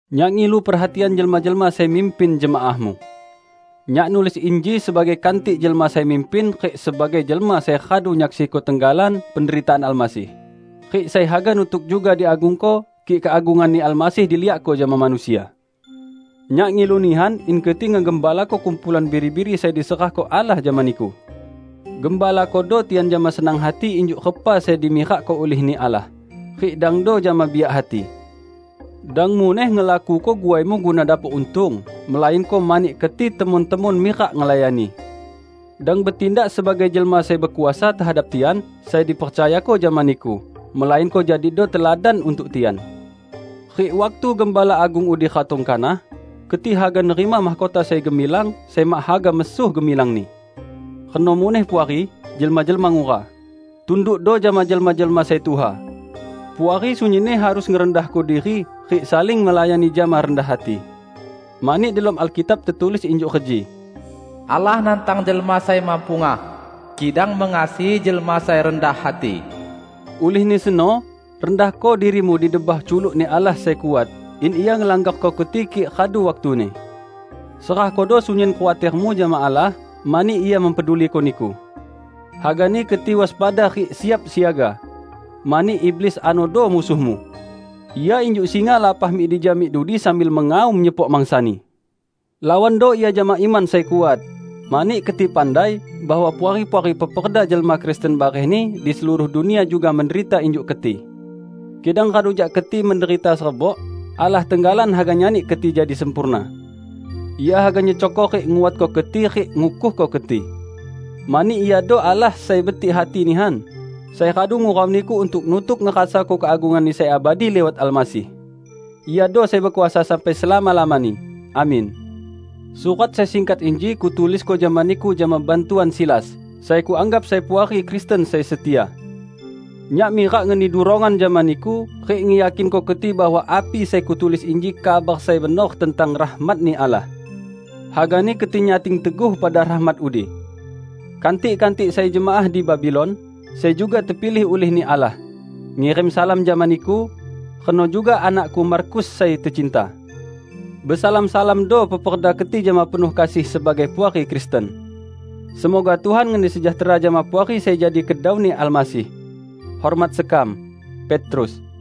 Nyak ngilu perhatian jelma-jelma sai mimpin jemaahmu. Nyak nulis inji sebagai kantik jelma sai mimpin rik sebagai jelma sai radu nyaksiko tenggalan penderitaan Almasih, rik sai haga nutuk juga diagungko, kik keagungan-Ni Almasih diliakko jama manusia. Nyak ngilu nihan in keti ngegembalako kumpulan biri-biri sai diserahko Allah jama niku. Gembalakodo tian jama senang hati injuk repa sai dimirakko ulih-Ni Allah, rik dangdo jama biak hati. Dang muneh ngelakuko guaimu guna dapok untung, melainko mani keti temon-temon mirak ngelayani. Dang betindak sebagai jelma sai bekuasa tehadap tian sai dipercayako jama niku, melainko jadido teladan untuk tian. Rik waktu Gembala Agung udi ratong kanah, keti haga nerima mahkota sai gemilang, sai mak haga mesuh gemilangni. Reno muneh Puari, jelma-jelma ngura. Tundukdo jama jelma-jelma sai tuha. Puari sunyinni harus ngerendahko diri rik saling ngelayani jama rendah hati. Mani delom Alkitab tetulis injuk reji, "Allah nantang jelma sai mepungah, kidang mengasihi jelma sai rendah hati." Ulihni seno, rendahko dirimu di debah culuk-Ni Allah sai kuat, in Ia ngelanggarko keti kik radu waktuni. Serahkodo sunyin khuatermu jama Allah, mani Ia mempeduliko niku. Hagani keti waspada rik siap siaga! Mani iblis anodo musuhmu. Ia injuk singa lapah mik dija mik dudi sambil mengaum nyepok mangsani. Lawando ia jama iman sai kuat, mani keti pandai bahwa puari-puari peperda jelma Kristen barehni di seluruh dunia juga menderita injuk keti. Kidang radu jak keti menderita serebok, Allah tenggalan haga nyani keti jadi sempurna. Ia haga nyecokko rik nguatko keti rik ngukuhko keti. Mani Iado Allah sai betik hati nihan, sai radu ngurau niku untuk nutuk ngerasako keagungan-Ni sai abadi liwat Almasih. Iado sai bekuasa sampai selama-lamani! Amin. Surat sai singkat inji kutulisko jama niku jama bantuan Silas, sai kuanggap sai puari Kristen sai setia. Nyak mirak ngeni durongan jama niku rik ngeyakinko keti bahwa api sai kutulis inji kabar sai benor tentang rahmat-Ni Allah. Hagani keti nyating teguh pada rahmat udi. Kantik-kantik sai jemaah di Babilon, sai juga tepilih ulih-Ni Allah, ngirim salam jama niku; reno juga anakku Markus sai tecinta. Besalam-salamdo peperda keti jama penuh kasih sebagai puari Kristen. Semoga Tuhan ngeni sejahtera jama Puari sai jadi kedau-Ni Almasih. Hormat sekam, Petrus